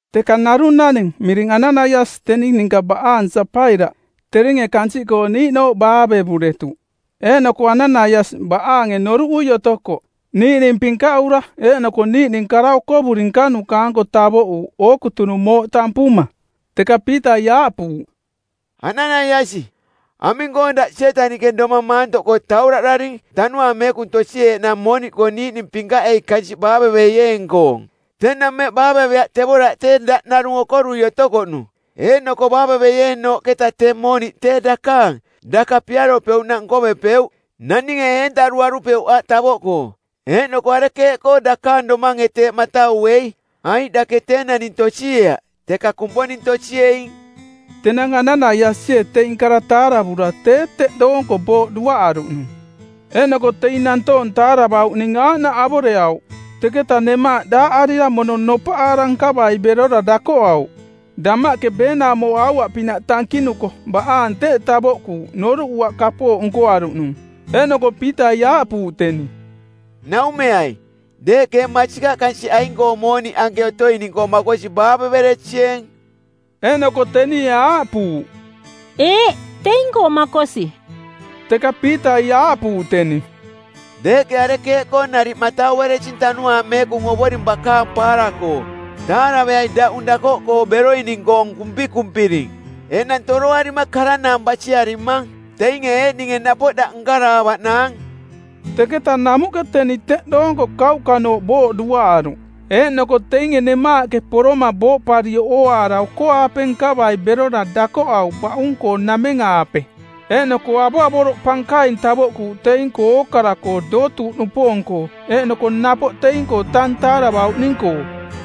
Teka narung naning miring Ananaiasi teni ninka baꞌaang Sapaira, teringe kansiꞌkoo niiꞌnooꞌ baavevuretuꞌ. Eeꞌnoko Ananaiasi, baꞌaange noruꞌui otoko, niiꞌning pinkaꞌura eeꞌnoko niiꞌning kara okovuri nkanuka-anko tavoꞌuuꞌ ookutunung mooꞌ tampuma. Teka Piitai aaꞌpuuꞌ, “Ananaiasi, aming-koo daꞌ Sietaniꞌke domang maantoꞌkoo tauraꞌdaring Tanuaang Meekung tosieeꞌnaang mooniꞌkoo niiꞌning pinkaꞌei kansiꞌ baaveveieeng-koong? Tenang mmeꞌ baaveveaꞌ tevoraꞌ tee daꞌ narung okorui otokoꞌnung. Eeꞌnoko baaveveieenooꞌketa tee mooniꞌ tee dakaang, daka piaropeuꞌnaꞌ nkovepeuꞌ. Naninge eturuarupeuꞌ aꞌ tavoꞌkoo. Eeꞌnoko arekeeꞌkoo dakaang domange teeꞌ matauei? Aiꞌ dake tee naning tosieaꞌ, teka Kumponing tosieing.” Tenang Ananaiasie teing kara taaravura tee teꞌ doonko booꞌ duaꞌaruꞌnung. Eeꞌnoko teing nantoong taaravauꞌning aaꞌnaꞌ avoreauꞌ. Teketa nemaaꞌ daaꞌarira mono nopaꞌaara nkavai berora dakoꞌauꞌ. Damaꞌke beenaumo aua-pinaꞌ tankinuko baꞌaang teꞌ tavoꞌkuuꞌ noruꞌuaꞌ kapooꞌ nkoaruꞌnung. Eeꞌnoko Piitai aaꞌpuuꞌ teni, “Naumeai, deeꞌke ee masikaꞌ kansiꞌ aing-koo mooniꞌ anke otoining-koo makosi baaveveresieeng?” Eeꞌnoko tenie aaꞌpuuꞌ, “Eeꞌ, teing-koo makosi.” Teka Piitai aaꞌpuuꞌ teni, “Deeꞌke arekeeꞌkoo nariꞌ mataueresing Tanuaang Meekung Ovoring bakaang paara-koo? Taaraveai daꞌung dakoꞌkoo beroining-koong kumpikumpiring, enang toroarima karanaang basiarimang. Teinge eeꞌninge napoꞌ daꞌ nkaraavaꞌnaang.” Teketa namuꞌke teni teꞌ doonko kauꞌkanooꞌ booꞌ duaꞌaruꞌ. Eeꞌnoko teinge nemaaꞌke poroma booꞌparioꞌ ooaara oko-aape nkavai berora dakoꞌauꞌ baꞌung-koo nameng-aape. Eeꞌnoko avoꞌavoroꞌ pankaing tavoꞌkuuꞌ teing-koo ookara-koo dootuuꞌnupoong-koo eeꞌnoko napoꞌ teing-koo tang taaravauꞌning-koo.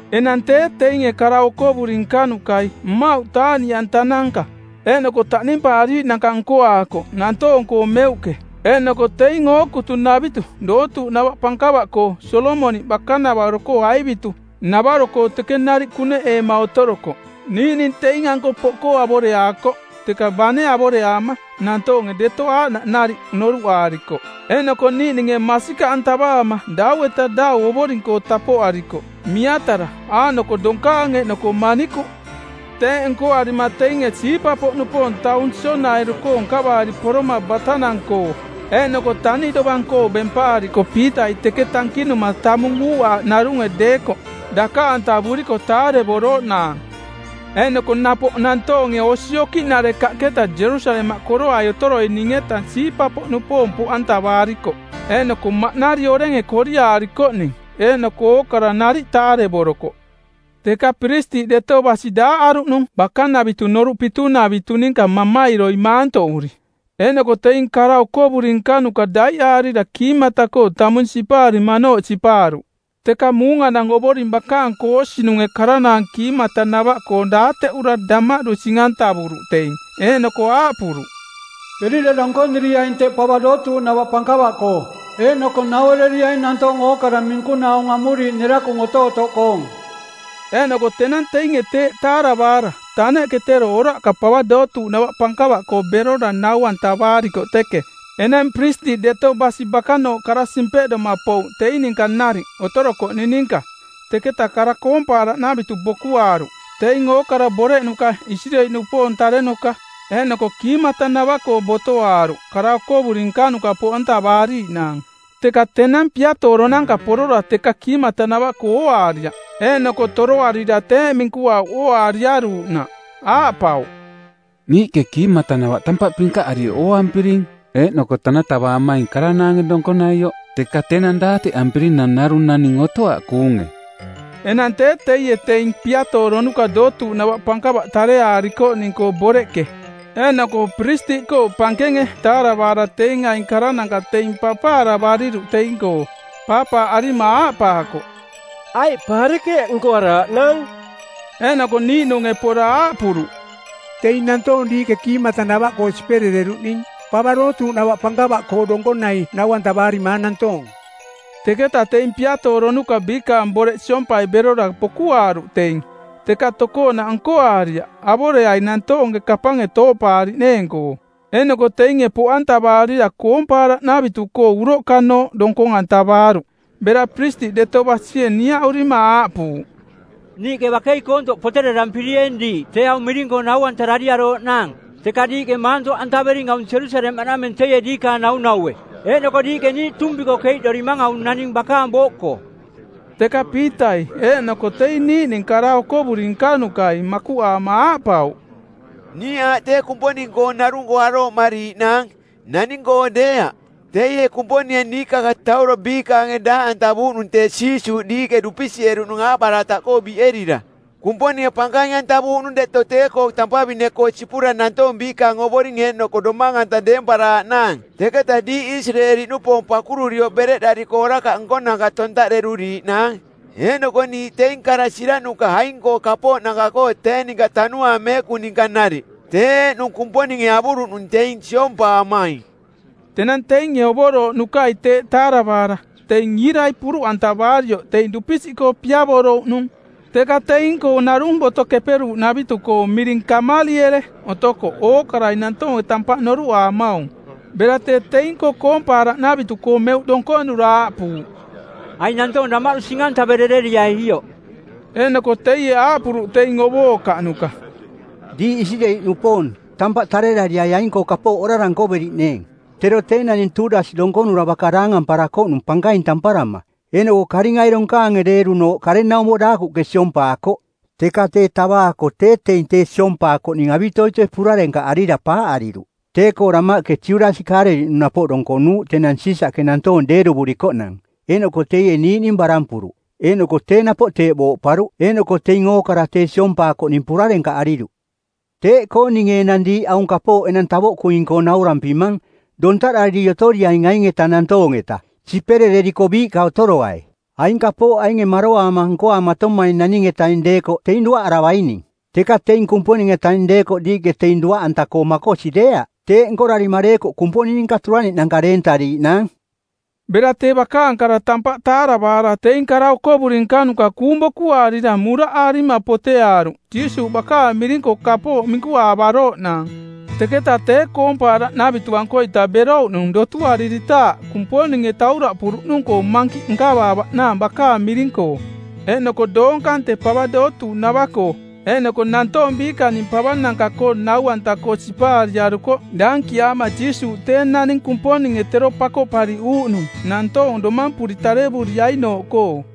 Enang tee teinge kara okovuri nkanukai mmauꞌ taaꞌniꞌantananka eeꞌnoko taꞌnimpaariiꞌnanka nkoaakoꞌ nantoong-koo meuꞌke, eeꞌnoko teing ookutunavitu dootuuꞌnava pankava-koo Solomoniꞌ bakanavaro aivitu˜navaro-koo teke nariꞌ kuneꞌeema otorokoꞌ. Niiꞌning teing-anko poꞌkoo avoreaakoꞌ, teka bane avoreaama nantoonge deto aaꞌnaꞌ nariꞌ noruꞌaarikoꞌ. Eeꞌnoko niiꞌninge masikaꞌantavaama dau-eta dau Ovoring-koo tampoꞌarikoꞌ, miatara, aaꞌnoko donkaang eeꞌnoko manikuꞌ. Teeꞌ nkoarima teinge siipa-poꞌnupoong taung sionairu-koo nkavaari poroma batanang-koo eeꞌnoko taniꞌ dovang-koo bempaarikoꞌ Piitai teke tankinuma tamung uuꞌaaꞌ narunge deekoꞌ, dakaꞌantavuriko taarevorooꞌnaang. Eeꞌnoko napoꞌ nantoonge osi okiꞌnarekaꞌketa Jerusalemaꞌ koroai otoroining-eta siipa-poꞌnupoong poꞌantavaarikoꞌ eeꞌnoko maꞌnari orenge koriaarikoꞌning, eeꞌnoko ookara nariꞌ taarevorokoꞌ. Teka piristiꞌ deto basi daaꞌaruꞌnung bakanavitu Noruꞌ Pitunavitu ninka mamairoi maantoꞌuri. Eeꞌnoko teing kara okovuri nkanuka daiꞌaarira kiimatanava-koo tamung sipaarimanooꞌ sipaaruꞌ. Teka muunganang Ovoring bakaang koosinunge karanaang kiimatanava-koong daateꞌura damaꞌdu sing-antavuruꞌ teing, eeꞌnoko aaꞌpuruꞌ, “Berira donkoniriaing teꞌ pava dootuuꞌnava pankava-koo eeꞌnoko nauereriaing nantoong ookara minkunaa aung amuriiꞌ nerakung otootoꞌkoong.” Eeꞌnoko tenang teinge teeꞌ taaravaara taneꞌke tero oraꞌka pava dootuuꞌnava pankava-koo berora nau-antavaarikoꞌ teke. Enang piristiꞌ deto basi bakanooꞌ kara simpeꞌdoma pouꞌ teing ninka nariꞌ otorokoꞌning ninka, teketa koompaaraꞌnavitu bokuaaruꞌ, teing ookara boreꞌnuka Isireeli-nupoong tarenuka, eeꞌnoko kiimatanava-koo botoaaruꞌ kara okovuri nkanuka poꞌantavaariiꞌnaang. Teka tenang piatooronanka˜ porora teka kiimatanava-koo ooaariaꞌ, eeꞌnoko toroarira teeꞌ minkuauꞌ ooaariaruuꞌnaꞌ. Aaꞌpauꞌ, “Niiꞌke kiimatanava tampaꞌ pinkaꞌarioꞌ ooampiring, eeꞌnoko tanatavaamaing karanaange donkonaioꞌ, teka tenang daateꞌampirinang narung naning otoaꞌ kuunge.” Enang tee teie teing piatooronuka dootuuꞌnava pankava tareaakoꞌning-koong boreꞌke eeꞌnoko piristiꞌkoo pankenge taaravaara teing aing karananka teing papaaravariruꞌ teing-koo. Paapaaꞌarima aaꞌpaakoꞌ, “Aiꞌ pa arekeeꞌ nkoaraaꞌnaang?” Eeꞌnoko niiꞌnunge pora aaꞌpuruꞌ, “Teing nantoong diiꞌke kiimatanava-koo siperereruꞌning pava dootuuꞌnava pankava-koo donkonai nau-antavaarimaang nantoong.” Teketa teing piatooronuka biikaang boreꞌ siompai berora bokuaaruꞌ teing, teka tokoonaꞌ nkoaariaꞌ avoreai nantoonge kapange tooꞌpaariꞌneeng-koo. Eeꞌnoko teinge poꞌantavaarira koompaaraꞌnavitu-koo uroꞌkanooꞌ donkong-antavaaruꞌ. Bera piristiꞌ deto basie niaꞌurima aaꞌpuuꞌ, “Niiꞌke bakei koontoꞌ poterarampirieeng diiꞌ tee aung miring-koo nau-antarariarooꞌnaang. Teka diiꞌke maantoꞌantavering aung Jerusalemaꞌnameng teie diikaang naunaue, eeꞌnoko diiꞌke niiꞌ tuumpi-koo keiꞌdorimang aung naning bakaang booꞌkoo.” Teka Piitai eeꞌnoko teing niiꞌning kara okovuri nkanukai makuꞌaama aaꞌpauꞌ, “Niiꞌ aaꞌ tee Kumponing-koo narung-koo arooꞌmariiꞌnaang, naning-koo deeaꞌ. Teie Kumponinge niikakatauro biikaange daaꞌantavuuꞌnung tee Jiisuuꞌ diiꞌke dupisiꞌeruꞌnung aaꞌbarataꞌkoo biꞌerira. Kumponinge pankaing-antavuuꞌnung deto tee-koo tampavine-koo sipura nantoong biikaang Ovoring eeꞌnoko Domang-anta deemparaaꞌnaang teketa diiꞌ Isireeli-nupoong pakururioꞌ bereꞌdariko orakaꞌ nkonanka tontaꞌderuriiꞌnaang. Eeꞌnoko niiꞌ teing kara siraꞌnuka aing-koo kapooꞌnanka-koo tee ninka Tanuaang Meekung ninka nariꞌ, tee eeꞌnung Kumponinge avuruꞌnung teing siompaamaing.” Tenang teinge ovorooꞌnukai teeꞌ taaravaara teing iirai puruꞌantavurioꞌ teing dupisiꞌkoo piavorouꞌnung. Teka teing-koo narung Boto Keperuuꞌnavitu˜koong miring Kameliele otokoꞌ ookarai nantoonge tampaꞌ noruꞌaamaung. Bera tee teing-koo koompaaraꞌnavitu-koo meuꞌke donkonura aaꞌpuuꞌ, “Aing nantoong damaꞌdu sing-antaverereriai ioꞌ.” Eeꞌnoko teie aaꞌpuruꞌ teing ovookaꞌnuka, “Diiꞌ Isireeli-nupoong, tampaꞌ tarerariai aing-koo kapooꞌ orara nkoveriꞌneeng. Tero tee naning Tuudas donkonura baka daangamparakoꞌnung pankaing tamparama, eeꞌnoko karingai donkaange deerunooꞌ karenaumo daakuꞌke siompaakoꞌ. Teka tee tavaako tee teing tee siompaakoꞌning avitoitoi purarenkaꞌarira paaꞌariruꞌ. Tee-koo damaꞌke Judasi Kaaleliꞌnung napoꞌ donkonuuꞌ tenang Siisaꞌke nantoong deeruvurikoꞌnang, eeꞌnoko teie niiꞌning barampuruꞌ. Eeꞌnoko tee napoꞌ teeꞌ booꞌparuꞌ eeꞌnoko teing ookara tee siompaakoꞌning purarenkaꞌariruꞌ. Teeꞌkoo ninge enang diiꞌ aung kapooꞌ enang tavoꞌkuing-koo naurampimang, dontaꞌdariri otoriaing aing-eta nantoong-eta, siperereriko biiꞌka otoroai. Aing kapooꞌ ainge maroaama nkoaamatomaing naning-etaing deekoꞌ teing duaꞌaravaining. Teka teing Kumponing-etaing deekoꞌ diiꞌke teing duaꞌanta-koo makosi deeaꞌ. Teeꞌ nkorarima deekoꞌ Kumponing ninka turaniꞌnanka deentariiꞌnaang.” Bera tee bakaang kara tampaꞌ taaravaara teing kara okovuri nkanuka kuung bokuaarira muraꞌaarima poteaaruꞌ Jiisuuꞌ bakaang miring-koo kapooꞌ minkuaavarooꞌnaang. Teketa tee koompaaraꞌnavitu-ankoita berouꞌnung dotuariritaaꞌ Kumponinge tauraꞌpuruꞌnung-koo mankiꞌ nkavaavaꞌnaang bakaang miring-koo. Eeꞌnoko doong kante pava dootuuꞌnava-koo eeꞌnoko nantoong biikaning pavananka-koo nau-anta-koo sipariarukoꞌ daankiaama Jiisuuꞌ tee naning Kumponinge tero Pakoꞌpariꞌuuꞌnung˜ nantoong domampuri tarevuriainooꞌkoo.